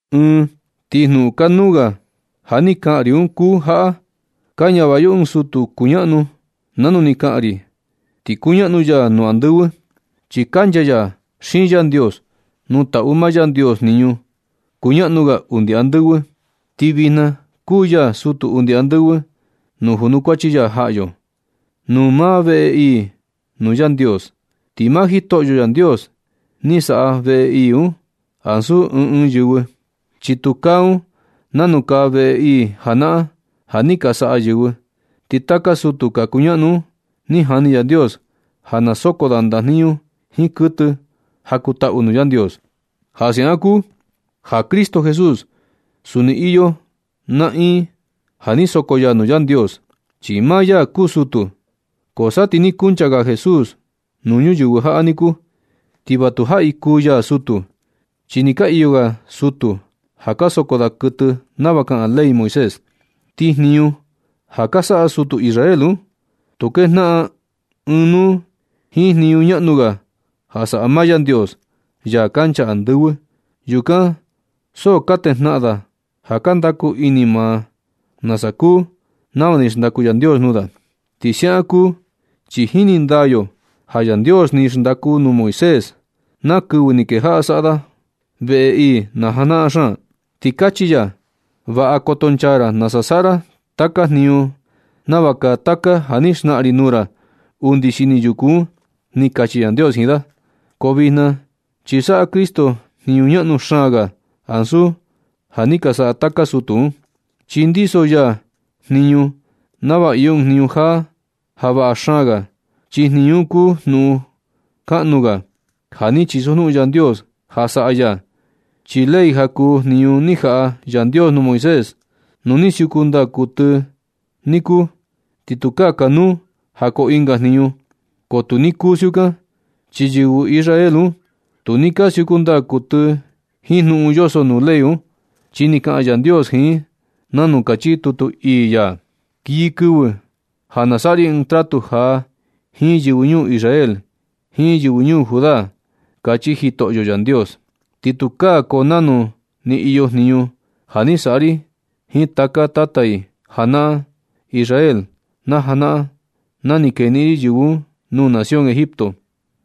Ɨɨn ti jnuꞌun kanuu ga ja ni kaꞌan ri un kuu jaꞌa: ka ñavaꞌa yo ɨɨn sutu kuñaꞌnu nanu ni kaꞌan ri, ti kuñaꞌnu ya nuu andɨvɨ, chi kancha ya xiin Yandios nuu taꞌu maa Yandios jniñu kuñaꞌnu ga undi andɨvɨ. Ti vijna kuu ya sutu undi andɨvɨ nuu junukuachi ya jaꞌa yo nuu maa veꞌe ii nuu Yandios. Ti maa Jitoꞌo Yandios ni saꞌa veꞌe ii un, ansu ɨɨn ɨɨn yɨvɨ, chi tu kaa un nanu kaa veꞌe ii janaꞌan ja ni ka saꞌa yɨvɨ. Ti taka sutu ka kuñaꞌnu un ni jani Yandios ja na soko da ndajniñu jiin kuɨtɨ ja kuu taꞌu nuu Yandios. Ja siaꞌan kuu ja Cristo Jesús suni iyo naꞌiin ja ni soko ya nuu Yandios, chi maa ya kuu sutu. Ko sa ti ni kuncha ga Jesús nuu ñuyɨvɨ jaꞌa niku, ti va tujaꞌi kuu ya sutu, chi ni ka iyo ga sutu ja ka soko da kuɨtɨ nava kaꞌan ley Moisés. Ti jniñu ja ka saꞌa sutu Israel un, tu kejnaꞌan ɨɨn nuu jiin jniñu ñaꞌnu ga ja saꞌa maa Yandios, Ya kancha andɨvɨ. Yukan so ka natejnaꞌan da ja ka ndaku ini maa da nasa kuu nava ni xndaku Yandios nuu da. Ti siaꞌan kuu chi jini ndaa yo ja Yandios ni xndaku nuu Moisés na kɨvɨ ni kejaꞌa saꞌa da veꞌe nii najanaꞌan xaan, ti ni kachi ya: “Vaꞌa koto nchaa ra nasa saꞌa ra taka jniñu nava kaa taka ja ni xnaꞌan ri nuu ra undi xini yuku un”, ni kachi Yandios jiin da. Ko vijna chi saꞌa Cristo jniñu ñaꞌnu xaan ga ansu ja ni ka saꞌa taka sutu un, chi ndiso ya jniñu nava iyo ɨɨn jniñu jaa ja vaꞌa xaan ga, chi jniñu un kuu jnuꞌun kaꞌnu ga ja ni chisojnuꞌun Yandios ja saꞌa ya. Chi ley ja kuu jniñu ni jaꞌa Yandios nuu Moisés, nu ni siuku ndaa kuɨtɨ ni kuu, ti tukaa kanuu ja koo ɨnga jniñu, ko tu ni kuu siukan, chi yɨvɨ Israel un tu ni ka siuku ndaa kuɨtɨ i jiin jniñu yoso nuu ley un. Chi ni kaꞌan Yandios jiin i nanu kachi tutu ii ya: Kii kɨvɨ ja na nasaꞌa ri ɨɨn tratu jaa jiin yɨvɨ ñuu Israel jiin yɨvɨ ñuu Judá, kachi Jitoꞌyo Yandios. Ti tukaa koo nanu ni iyo jniñu ja ni saꞌa ri jiin taka tata i janaꞌan Israel na janaꞌan na ni keniꞌin ri yɨvɨ un nuu nación Egipto.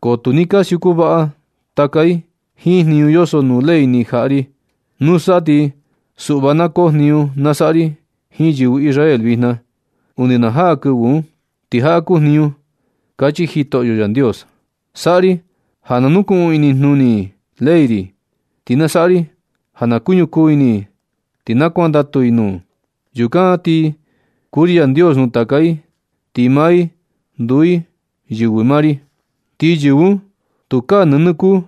Ko tu ni ka siuku vaꞌa taka i jiin jniñu yoso nuu ley ni jaꞌa ri. Nusa ti suꞌva na koo jniñu nasaꞌa ri jiin yɨvɨ Israel vijna, undi na jaa kɨvɨ un. Ti jaꞌa kuu jniñu, kachi Jitoꞌo Yandios. Saꞌa ri ja na nukuꞌun inijnuni i ley ri, ti na saꞌa ri ja na kuñukuu ini i ti na kuandatu i nuu. Yukan na ti kuu ri Yandios nuu taka i, ti maa i nduu yɨvɨ maa ri. Ti yɨvɨ un tukaa nɨnɨ kuu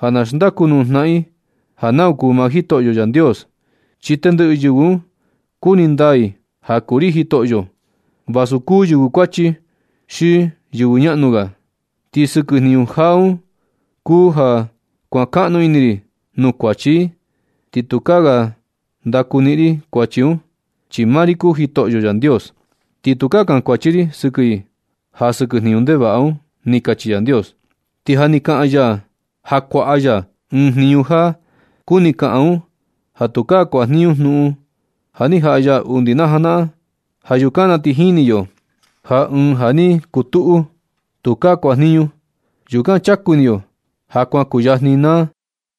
ja na xndaku nuu jnaꞌan i ja nau kuu maa Jitoꞌo Yandios. Chi tendɨꞌɨ yɨvɨ un kuni ndaa i ja kuu ri Jitoꞌo, vasu kuu yɨvɨ kuachi xi yɨvɨ ñaꞌnu ga. Ti sɨkɨ jniñu jaa un kuu ja kuan kaꞌnu ini ri nuu kuachi i, ti tukaa ga ndaku niꞌin ri kuachi un, chi maa ri kuu Jitoꞌo Yandios. Ti tukaa kankuachi ri ri sɨkɨ i ja sɨkɨ jniñu ndevaꞌa un. Ni kachi Yandios. Ti ja ni kaꞌan ya ja kuaꞌa ya ɨɨn jniñu jaa, kuni kaꞌan un ja tukaa kuajniñu jnuꞌun ja ni jaꞌa ya undi najanaꞌan. Ja yukan na ti jini yo ja ɨɨn ja ni ku tuꞌu, tukaa kuaniñu. Yukan chaku ini yo ja kuan kuyajni naa.